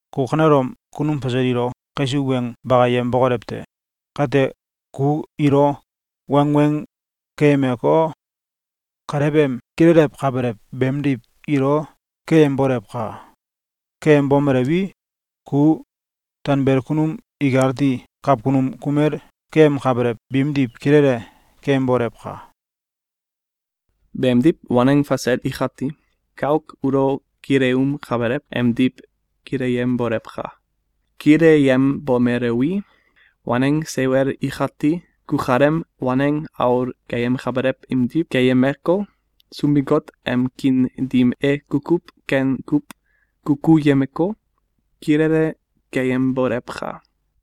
Ku kanelom kunum fasel ilo kaisuw weng bakayem bokolew te! Kate, ku ilo wangweng keyemeko, kalew em kilelewkabelew beemdiw ilo keyembolewka! Keyembomelewi, ku tanbelel kunum ikati kawkunum kumel keyemkabelew biimdiw kilele keyembolewka! Beemdiw, waneng fasel ikati kauk ulo kileumkabelew emdiw kileyembolewka! Kileyembomelewi, waneng seiwel ikati kukalem waneng aul keyemkabelew imdiw keyemeko, Sunbin-Got em kiin dim e kukuw ken kuw kukuyemeko, kilele keyembolewka!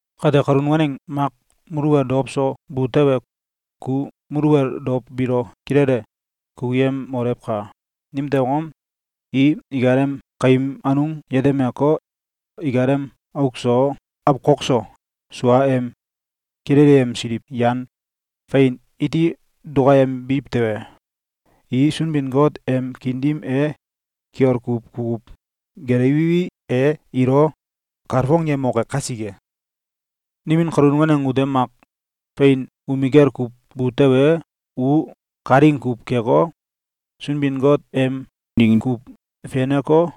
Kate, kalun waneng mak muluwel dow so bu tewe, ku muluwel dow biilo kilele kukuyemolewka! Nimtew angom? I ikalem kaim anung yetemeko, ikalem auk so awkok so, sua em kilelyemsiliw yan fein iti dukayembiw tewe, i Sunbin-Got em kiin dim e kiol kuw kukuw gelewiwi, e ilo kalfongyemoke kasike. Nimin kalun waneng ute mak fein umikel kuw bu tewe, u kalaing kuw keko, Sunbin-Got em ding kuw feneko,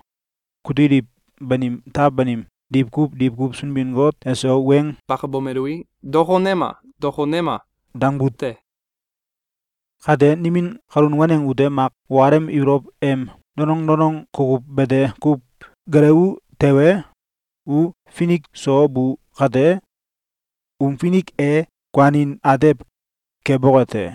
kutiliw banim taw banim diwkuw diwkuw Sunbin-Got eso weng bakabomelui, “Dokonema! Dokonema!”, dangbu te. Kate, nimin kalun waneng ute mak ukalem ibolow em danong danong kukuw bete kuw gelewu tewe, u finik so bu kate, um finik e kuanin atew keboke te.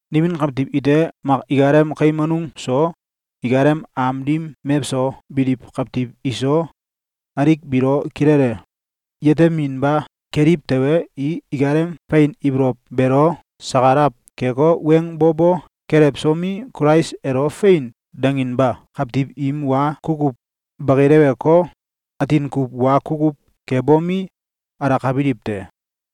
Nimin kawtiw ite mak ikalem kaim anung so, ikalem am dim mewso biliw kawtiw iso, alik biilo kilele yeteminba keliw tewe, i ikalem fein ibolow beelo sakalaw keko, weng bo bo kelewsomi, Kulais elo “Fein!”, danginba kawtiw im wa kukuw bakileweko, atin kuw wa kukuw kebomi, alakabiliw te.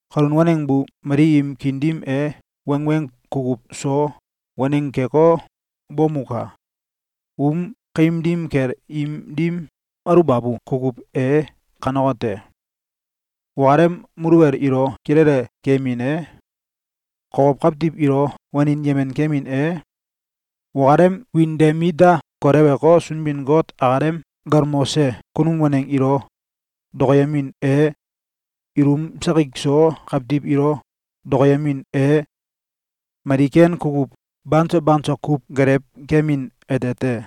Kalun waneng bu mali im kiin dim e wangweng kukuw so waneng keko, bomuka! Um kaim dim kel im dim aluwbabu kukuw e kanekote: Ukalem muluwel ilo kilele keyemin e, kokow kawtiw ilo wanin yemen kemin e, ukalem wiin de mit da koleweko, Sunbin-Got akalem galmose kunum waneng ilo dokoyemin e, ilum sakik so kawtiw ilo dokoyemin e, mali ken kukuw banso banso kuw gelewkemin ete te.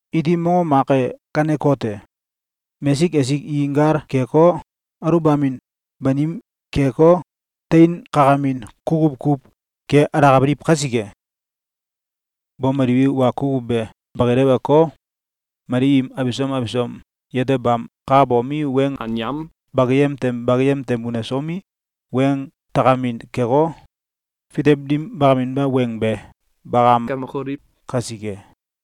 Iti mongom mak e kanekote: Mesik esik i gal keko, aluwbamin banim keko, teinkakamin kukuw kuw ke alakabiliw kasike. Bomeliwi, wa kukuw be bakileweko, mali im abisom abisom yetebam kakabomi, weng anyam bakakayem tem bakayem tem unesomi, weng takemin keko, fitew dim bakaminba weng be bakamkamokoliw kasike.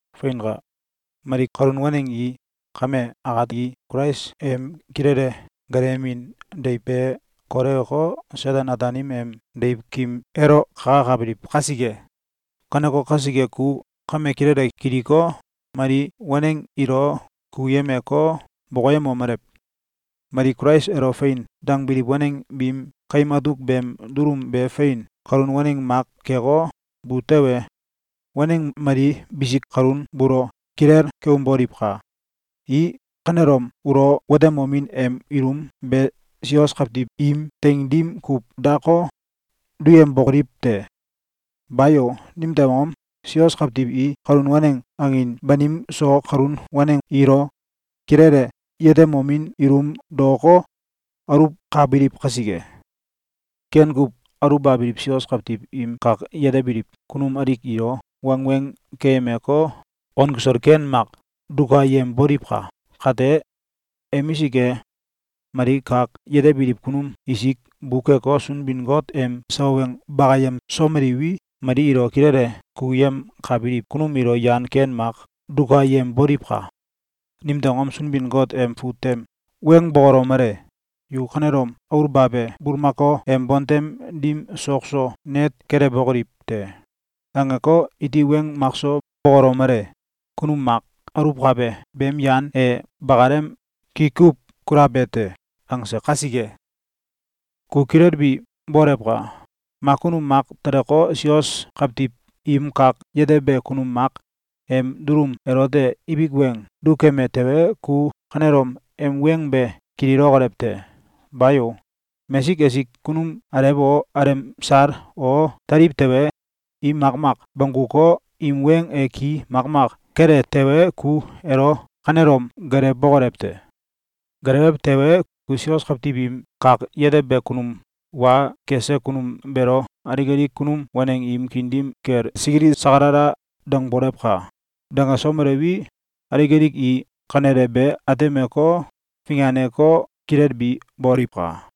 Feinka! Mali kalun waneng i kame akati Kulais em kilele gelewemin deiw be kolewko, Seten-Ataanim em deiwkim elo kakakabiliw kasike. Kaneko kasike, ku kame kilele kiliko, mali waneng ilo kukuyemeko, bokoyemomelew: Mali Kulais elo “Fein!”, dangbiliw waneng biim kaim atuk beem dulum be fein kalun waneng mak keko, bu tewe, waneng mali bisik kalun buulo kilel keumboliwka! I kanelom ulo watebomin em ilum be sios kawtiw im teing dim kuw dako, duyembokoliw te! Bayo! Nimtew angom? Sios kawtiw i kalun waneng angin banim so kalun waneng ilo kilele yetemomin ilum daoko, aluwkabiliw kasike. Ken kuw aluwbabiliw sios kawtiw im kak yetebiliw kunum alik ilo wangweng keyemeko, on kisol ken mak dukayemboliwka! Kate emisik e, mali kak yetebiliw kunum isik bukeko, Sunbin-Got em sawa weng bakayemsomeliwi, mali ilo kilele kukuyemkabiliw kunum ilo yan ken mak dukayemboliwka! Nimtew angom? Sunbin-Got em fut tem weng bokolomele: “Yu kanelom aulbabe bulmakao em bontem dim sok so net kelewbokoliw te!”, angeko, iti weng makso bokolomele: “Kunum mak aluwkabe beem yan e bakalem ki kuw kulabe te!”, angse kasike. Ku kilelbi bolewka! Mak kunum mak teleko, sios kawtiw im kak yetebe kunum mak em dulum elote ibik weng dukeme tewe, ku kanelom em weng be kililokolew te! Bayo! Mesik esik kunum alew o alemsal o teliw tewe, i makmak bongguko, im weng e ki makmak kele tewe, ku elo kanelom geelewbokolew te! Geelewew tewe, ku sios kawtiw im kak yetebe kunum wa kese kunum beelo alik alik kunum waneng im kiin dim kel sikili sakalala dangbolewka! Dangesomelewi, alik alik i kanele be atemeko, finganeko, kilelbi boliwka!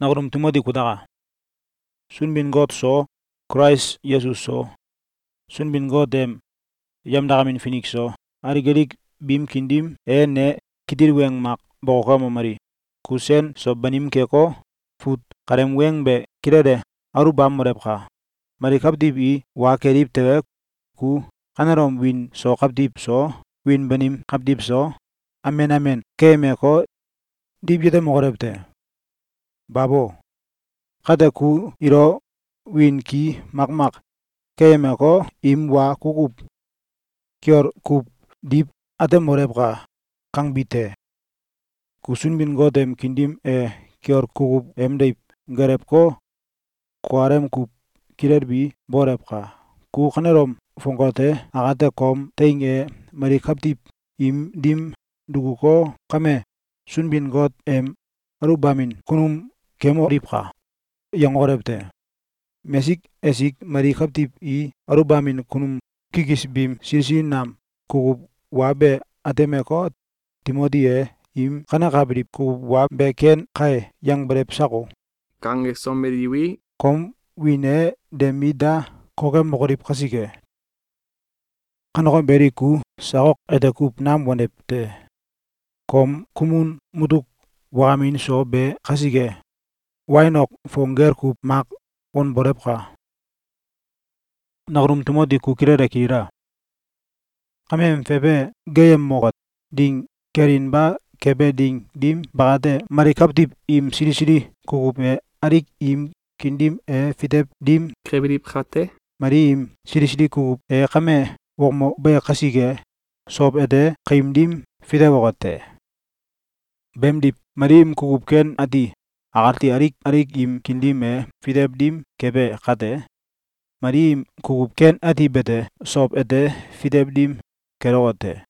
Nakunum Timoti kutaka! Sunbin-Got so, Kulais Yesus so, Sunbin-Got em yemdakamin finik so, alik alik biim kiin dim e ne kitil weng mak bokokemomeli: “Ku sen so banim keko, fut kaleem weng be kilele aluwbamolewka! Mali kawtiw i wa keliw tewe, ku kanelom wiin so kawtiw so, wiin banim kawtiw so, amen amen keyemeko, diw yetemokolew te! Babo! Kate ku ilo wiin ki makmak keyemeko, im wa kukuw kiol kuw diw atemolewka!”, kangbi te. Ku Sunbin-Got em kiin dim e kiol kukuw em deiw gelewko, kukalem kuw kilelbi bolewka! Ku kanelom fongate akate kom teing e mali kawtiw im dim dukuko, “Kame Sunbin-Got em aluwbamin kunum kemoliwka!”, yangokolew te! Mesik esik mali kawtiw i aluwbamin kunum kikis biim sili sili nam kukuw wa be atemeko, “Timoti e im kanekabiliw kukuw wa be ‘Ken kai!’, yangbelew sako?”, kangesomeliwi, kom wiin e de mit da kokemokoliw kasike! Kaneko beli, ku sak ok ete kuw nam wanew te! Kom kumun mutuk wakamin so be kasike, wain ok fong gel kuw mak wanbolewka! Nakunum Timoti ku kilele kilila! Kameem fefe geeyemoke ding kelinba kebe ding dim bakate, mali kawtiw im sili sili kukuw e alik im kiin dim e fitew dim kebiliw kate, mali im sili sili kukuw e kame wokmobe kasike, sow ete kaim dim fitewoke te. Beemdiw, mali im kukuw ken ati akati alik alik im kiin dim e fitew dim kebe kate, mali im kukuw ken ati bete sow ete fitew dim keloke te.